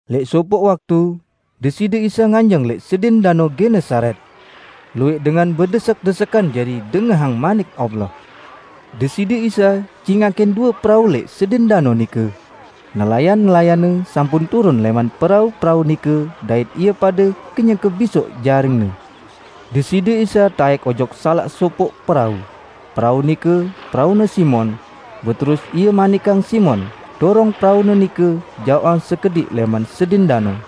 Lẽq sopoq waktu, Deside Isa nganjeng lẽq sedin Danao Genesaret. Luwẽq dengan bedesek-desekan jari dengahang Manik Allah. Deside Isa cingakin due perau lẽq sedin danao nike; nelayan-nelayanne sampun turun lẽman perau-perau nike dait ie pade kenyeke bisoq jaringne. Deside Isa taẽk ojok salaq sopoq perau, perau nike peraune Simon, beterus Ie manikang Simon dorong peraune nike jaoqan sekediq lẽman sedin danao.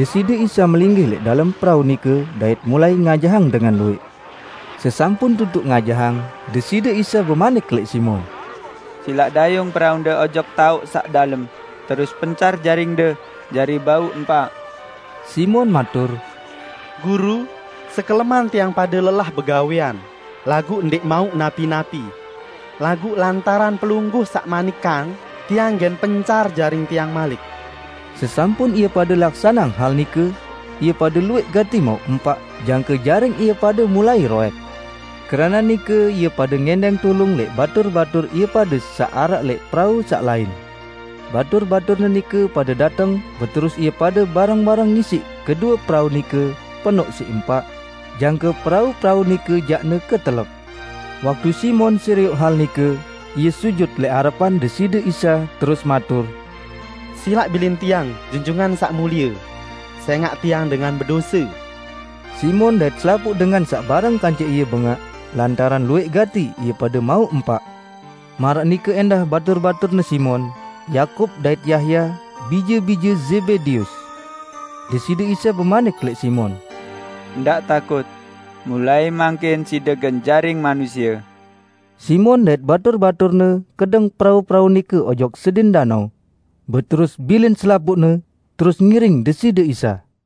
Deside Isa melinggih lẽq dalem perau nike dait mulai ngajahang dengan luwẽq. Sesampun tutuq ngajahang, Deside Isa bemanik lẽq Simon, "Silaq dayung peraunde ojok taoq saq dalem, terus pencar jaringde jari bau empaq." Simon matur, "Guru, sekeleman tiang pade lelah begawẽan, laguq ndẽq mauq napi-napi! Laguq lantaran Pelungguh saq manikang, tiang gen pencar jaring tiang malik." Sesampun ie pade laksaneang hal nike, ie pade luwẽq gati mauq empaq jangke jaring ie pade mulai roẽk. Keranaq nike ie pade ngẽndẽng tulung lẽq batur-batur ie pade saq araq lẽq perau saq lain. Batur-baturne nike pade dateng beterus ie pade bareng-bareng ngisiq kedue perau nike penoq siq empaq, jangke perau-perau nike jaqne ketelep. Waktu Simon serioq hal nike, ie sujut lẽq arepan Deside Isa terus matur, "Silaq bilin tiang, Junjungan Saq Mulie! Sẽngaq tiang dengan bedose!" Simon dait selapuq dengan saq bareng kance ie bengaq lantaran luwẽq gati ie pade mauq empaq. Maraq nike ẽndah batur-baturne Simon, Yakub dait Yahya, bije-bije Zebedeus. Deside Isa bemanik lẽq Simon, "Ndaq takut! Mulai mangkin side gen jaring manusie." Simon dait batur-baturne kedeng perau-perau nike ojok sedin danao, beterus bilin selapuqne, terus ngiring Deside Isa.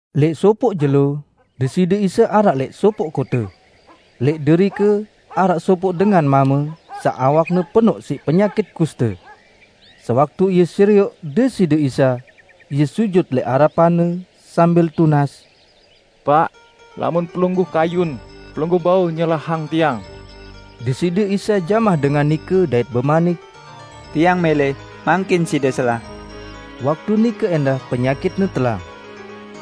Lẽq sopoq jelo, Deside Isa araq lẽq sopoq kote. Lẽq derike araq sopoq dengan mame saq awakne penoq siq penyakit kuste. Sewaktu ie serioq Deside Isa, ie sujut lẽq arepan-Ne sambil tunas, "Paq, lamun Pelungguh kayun, Pelungguh bau nyelahang tiang!" Deside Isa jamah dengan nike dait bemanik, "Tiang mẽlẽ, mangkin side selah!" Waktu nike ẽndah penyakitne telang.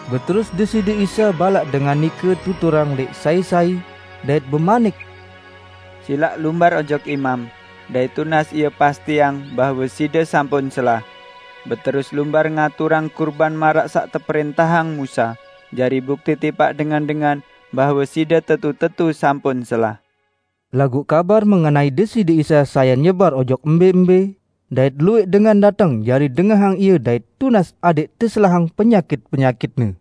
Beterus Deside Isa balaq dengan nike tuturang lẽq sai-sai, dait bemanik-Ne, "Silaq lumbar ojok imam, dait tunas ie pastiang bahwe side sampun selah. Beterus lumbar ngaturang kurban maraq saq teprẽntahang Musa, jari bukti tipaq dengan-dengan bahwe side tetu-tetu sampun selah." Laguq kabar mengenai Deside Isa sayan nyebar ojok mbẽ-mbẽ, dait luwẽq dengan dateng jari dengahang Ie dait tunas adẽq teselahang penyakit-penyakitne.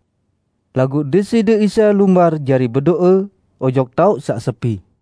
Laguq Deside Isa lumbar jari bedo'e ojok taoq saq sepi.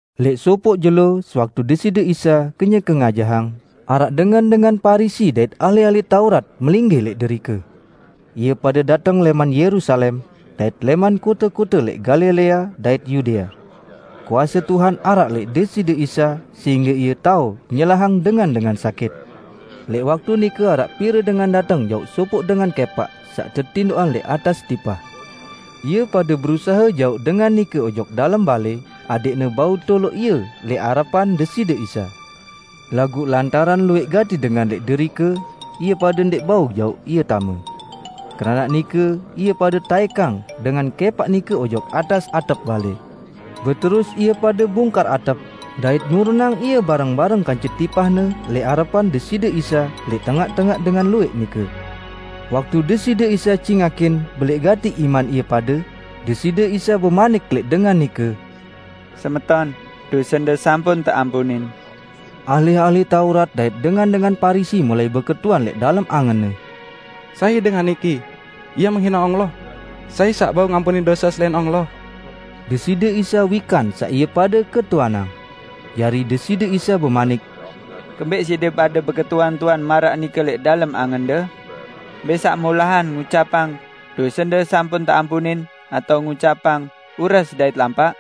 Lẽq sopoq jelo sewaktu Deside Isa kenyeke ngajahang, araq dengan-dengan Parisi dait ahli-ahli Taurat melinggih lẽq derike. Ie pade dateng lẽman Yerusalem, dait lẽman kote-kote lẽq Galilea dait Yudea. Kuase Tuhan araq lẽq Deside Isa sehingge Ie tao nyelahang dengan-dengan sakit. Lẽq waktu nike araq pire dengan dateng jauq sopoq dengan kẽpaq saq tetindoqang lẽq atas tipah. Ie pade berusahe jauq dengan nike ojok dalem balẽ adẽqne bau toloq ie lẽq arepan Deside Isa. Laguq lantaran luwẽq gati dengan lẽq derike, ie pade ndẽq bau jauq ie tame. Keranaq nike ie pade taẽkang dengan kẽpaq nike ojok atas atep balẽ. Beterus ie pade bungkar atep, dait nurunang ie bareng-bareng kance tipahne lẽq arepan Deside Isa lẽq tengaq-tengaq dengan luwẽq nike. Waktu Deside Isa cingakin belẽq gati iman ie pade, Deside Isa bemanik lẽq dengan nike, "Semeton, dosende sampun teampunin." Ahli-ahli Taurat dait dengan-dengan Parisi mulai beketuan lẽq dalem angenne, "Sai dengan niki? Ie menghine Allah? Sai saq bau ngampunin dose selain Allah?" Deside Isa wikan saq ie pade ketuanang. Jari Deside Isa bemanik, "Kembẽq side pade beketuan-tuan maraq nike lẽq dalem angende? Mbẽ saq molahan, ngucapang, 'Dosende sampun teampunin', atao ngucapang, 'Ures dait lampaq?'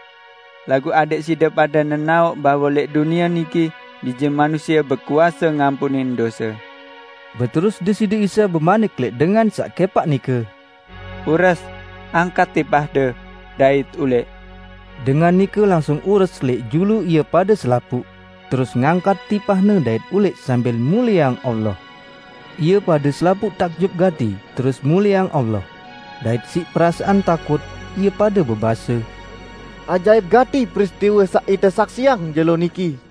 Laguq adẽq side pade nenaoq bahwe lẽq dunie niki Bije Manusie bekuase ngampunin dose." Beterus Deside Isa bemanik lẽq dengan saq kẽpaq nike, "Ures, angkat tipahde, dait ulẽq!" Dengan nike langsung ures lẽq julu ie pade selapuq, terus ngangkat tipahne dait ulẽq sambil mulieang Allah. Ie pade selapuq takjub gati terus mulieang Allah. Dait siq perasaan takut, ie pade bebase, "Ajaip gati peristiwe saq ite saksiang jelo niki!"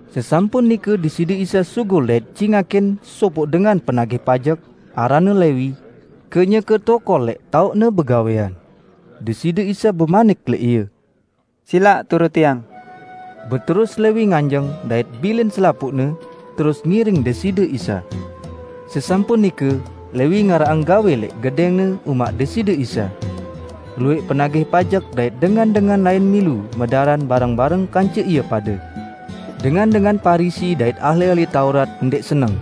Sesampun nike Deside Isa sugul dait cingakin sopoq dengan penagih pajek, aranne Lewi, kenyeke tokol lẽq taoqne begawẽan. Deside Isa bemanik lẽq ie, "Silaq turut Tiang." Beterus Lewi nganjeng dait bilin selapuqne, terus ngiring Deside Isa. Sesampun nike Lewi ngaraqang gawẽ lẽq gedẽngne umaq Deside Isa. Luwẽq penagih pajek dait dengan-dengan lain milu medaran bareng-bareng kance ie pade. Dengan-dengan Parisi dait ahli-ahli Taurat ndẽq seneng,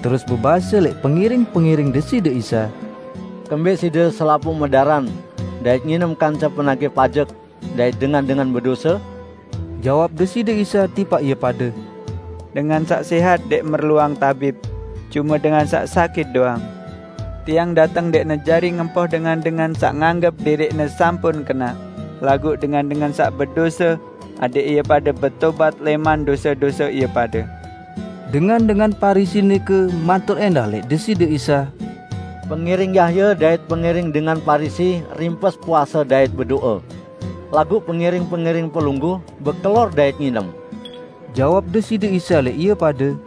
terus bebase lẽq pengiring-pengiring Deside Isa, "Kembẽq side selapuq medaran dait nginem kance penagih pajek dait dengan-dengan bedose?" Jawab Deside Isa tipaq ie pade, "Dengan saq sẽhat ndẽq merluang tabib; cume dengan saq sakit doang. Tiang dateng ndẽqne jari ngempoh dengan-dengan saq nganggep diriqne sampun kenaq, laguq dengan-dengan saq bedose adẽq ie pade betobat lẽman dose-dose ie pade." Dengan-dengan Parisi nike matur ẽndah lẽq Deside Isa, "Pengiring Yahya dait pengiring dengan Parisi rimpes puase dait bedo'e. Laguq pengiring-pengiring Pelungguh bekelor dait nginem." Jawab Deside Isa lẽq ie pade,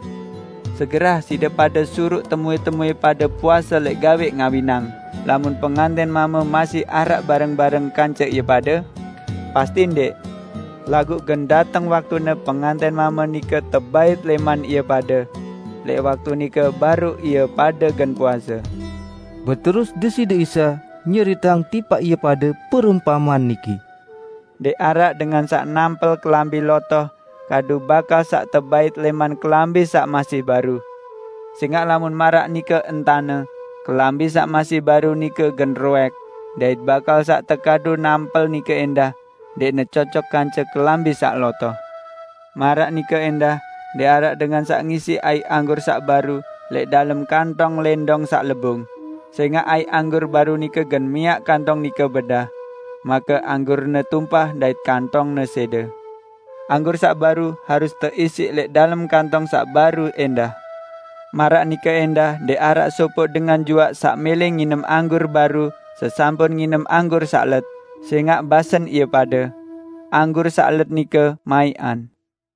"Segerah side pade suruq temuẽ-temuẽ pade puase lẽq gawẽ ngawinang lamun pengantẽn mame masih araq bareng-bareng kance ie pade? Pasti ndẽq! Laguq gen dateng waktune pengantẽn mame nike tebait lẽman ie pade. Lẽq waktu nike baruq ie pade gen puase." Beterus Deside Isa nyeriteang tipaq ie pade perumpamean niki, "Ndẽq araq dengan saq nampel kelambi lotoh kadu bakal saq tebait lẽman kelambi saq masih baru. Sẽngaq lamun maraq nike entane, kelambi saq masih baru nike gen roẽk. Dait bakal saq tekadu nampel nike ẽndah ndẽqne cocok kance kelambi saq lotoh. Maraq nike ẽndah ndẽq araq dengan saq ngisiq aiq anggur saq baru lẽq dalem kantong lẽndong saq lebung, sẽngaq aiq anggur baru nike gen miaq kantong nike bedah. Make anggurne tumpah dait kantongne sẽde. Anggur saq baru harus teisiq lẽq dalem kantong saq baru ẽndah. Maraq nike ẽndah ndẽq araq sopoq dengan juaq saq mẽlẽ nginem anggur baru sesampun nginem anggur saq let, sẽngaq basen ie pade, 'Anggur saq let nike maiqan.' "